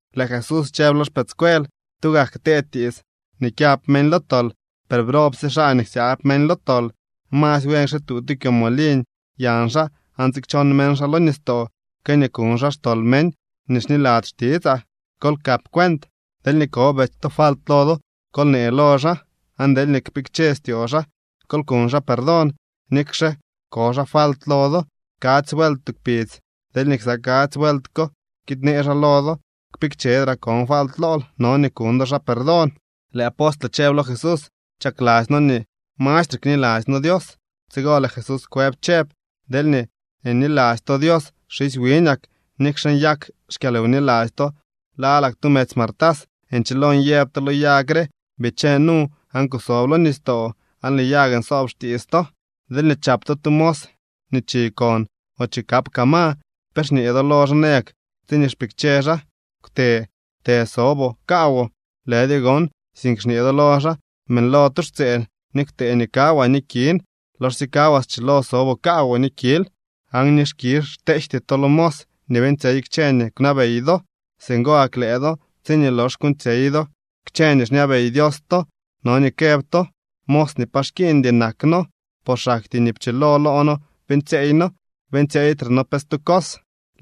Lëë Jesús chëb lo xpëëdscuel: —Tugak ktee tiits nii kyab meñ lo tol, per ¡brobsye xaa nii ksyaab meñ lo tol! Masy buen kxituu tu kyomoliñ yañ xaa aan tsikchon meñ xaa lo nistoo que nii kuñ xaa xtol meñ nii xniladzy xtitsaa. Kol kap cuent. ’Deelñee ko betsy to falt lo do, kol nee lo xaa, aan deelñee kpikche styoo xaa, kol kuñ xaa perdón. Nikxe ko xaa falt lo do kadzy vuelt tu kpidz, deelñee ksa kadzy vuelt ko kiid në xaa lo do: “Kpikchedraa kon falt lool”, no nii kuñ do xaa perdón. Lëë apostle chëb lo Jesús: —Chakladzy noo nii mastre kniladzy noo Dios. Tsigo lëë Jesús kwëb chëb: —Deelñee niladzy to Dios, xisy wiñak, nikxe nyak xkyalwniladzy to lalak tu medzy martas, nchilo nyëb to lo yag re: “Bichee nu aan kusob lo nistoo”, aan lëë yag nsoob xtiits to. ’Deelñee chap to tu mos nii chikon o chikap kaa ma, ¿pe xñee do lo xaa nayak tsiñee xpikche xaa: “Kwte të soboo kaawoo”? Lëdyo gon, sink xñee do lo xaa: “Beeñlo tu xtseen ni kwtëë nii kawaa ni kin. Loxsye kawaa schilo soboo kaawoo ni kil.” Aan ni skizh xteejty to lo mos nii beeñtsyey kchë nii kwnabey do. Singo gak lëë do, tsiñee lox kuuñtsyey do kchë nii xñabey Dios to, no nii këb to: “Mos nii pa xkiiñdy nak no, por xaktyee nii pchilo lo no beeñtsyeey no. Beeñtsyeeytre no pe stu cos.”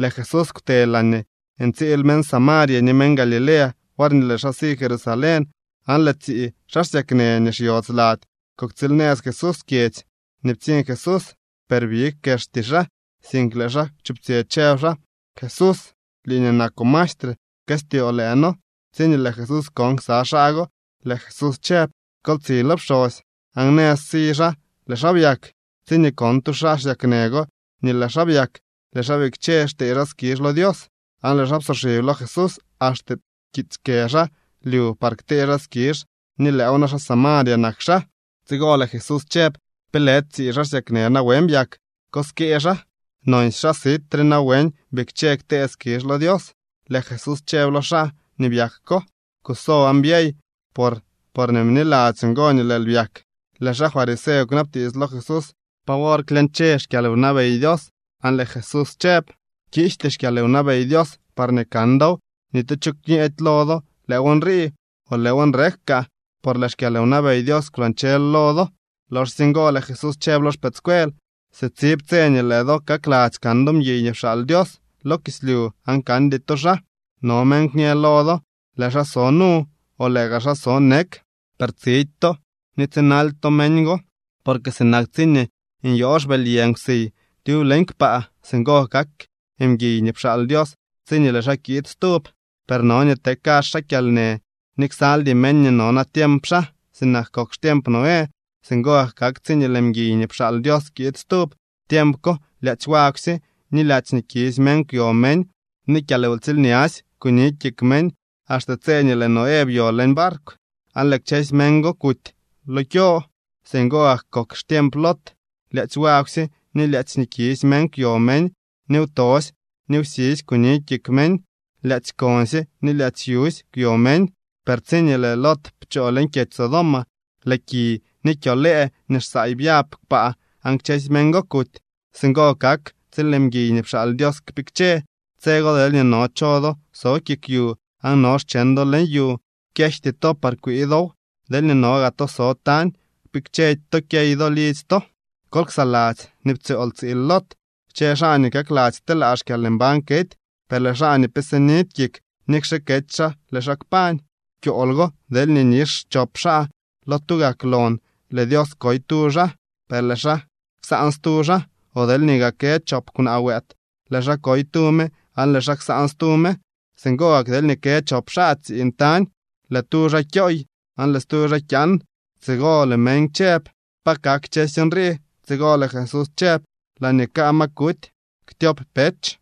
Lëë Jesús kwte laañee ntsiil meñ Samaria ni meñ Galilea worñee lëë xaa si Jerusalén, aan lëë tsii xaa xsyaknë nii xyodz lady kuktsiilnëz Jesús kyedzy nii ptsiñ Jesús, per big kexty xaa, sink lëë xaa kwchuptsyë, chëb xaa: —¡Jesús, lii nii nakoo maestre, pkëstyoo lëë noo! Tsiñee lëë Jesús kon ksa xaa go, lëë Jesús chëb: —Kol tsi lo pxosy. Aan nëz si xaa lëë xaa byak. Tsiñee kon tu xaa xsyaknë go nii lë xaa byak, lëë xaa bikche xtee xaa skizh lo Dios. Aan lëë xaa psoxib lo Jesús, axte pkiitsy kë xaa lyu par ktee xaa skizh ni lëëw na xaa Samaria nak xaa. Tsigo lëë Jesús chëb: —¿Pe lëdy tsii xaa xsyaknë nawen byak? ¿Ko skee xaa? ¿Nonsy xaa sit re nawen bikche ktee skizh lo Dios? Lëë Jesús chëb lo xaa nii byak ko: —Kuso aan byey. Por porñee bniladzyoo ngo nii lëël byak. Lëë xaa fariseo kwnabtiits lo Jesús pa wor klyañche xkyalwnabey Dios aan lëë Jesús chëb: —Kiijty xkyalwnabey Dios parñee kan dow. Ni tu cho kñëdy lo do: “Lëëw nrii”, o “Lëëw nrek kaa.” Por lëë xkyalwnabey Dios kwlañchel lo do. Loxsye ngo lëë Jesús chëb lo xpëëdscuel: —Sitsib tse nii lëë do kakladzy kan do mguiy nii pxaal Dios lo kislyu, aan kandy to xaa. No meñ kñë lo do: “Lëë xaa so nu”, o “lëë gaa xaa so nek.” Per tsidy to ni tsinaldy to meñ go. Porque sinak tsiñee nyoo xbëly yë nkwsiy tyub leñ kpaa, singo kak mguiy nii pxaal Dios tsiñee lëë xaa kiid stub. Per no nii te kazh xaa kyalnë ni ksaldy meñ nii no natiemp xaa. Sinak kok xtiemp Noé, singo gak kak tsiñee lëë mguiy nii pxaal Dios kiid stub. Tiemp ko lyaadzy wagwsye ni lyaadzy nii kisy meñ kwyo meñ, ni kyalwtsiilñasy kuni kik meñ, axte tse nii lëë Noé byo leñ barkw, aan lëë kchësy meñ go kuty lo kyo. Singo gak kok xtiemp Lot: lyaadzy wagwsye ni lyaadzy nii kisy meñ kwyo meñ, ni wtosy ni wsisy kuni kik meñ. Lyaadzy konsye ni lyaadzy yusy kwyo meñ. Per tsiñee lëë Lot pchoo leñ kyedzy Sodoma, lëë ki ni kyo lëë nii xsaay byab kpaa, aan kchësy meñ go kuty. Singo kak tsiñee lëë mguiy nii pxaal Dios kpikche. ’Tse go deelñee no cho do so kik yu aan no xcheñ do leñ yu, kyejty to par kwii dow. Deelñee no gaa to so tañ, kpikchedy to kyey do lidzy to. Kol ksaladzy nii ptsyool tsiil Lot. Kchë xaa nii kakladzy kteelaa xkyalmbañ kety. Per lëë xaa nii pe sinidy kik, nikxe kety xaa, lëë xaa kpañ. ’Kyool go deelñee nix chop xaa lo tugak lon, lëë Dios koy tu xaa, per lëë xaa ksaan stu xaa. O deelñee gaa kë chop kwnaa wëët, lëë xaa koy tu me aan lëë xaa ksaan stu me. Singo gak deelñee kë chop xaa tsiiñ tañ, lëë tu xaa kyooy, aan lëë stu kyaan. Tsigo lëë meñ chëb: —¿Pa kak kchësy nrii? Tsigo lëë Jesús chëb: —Laañee kaa ma kuty ktyop pech.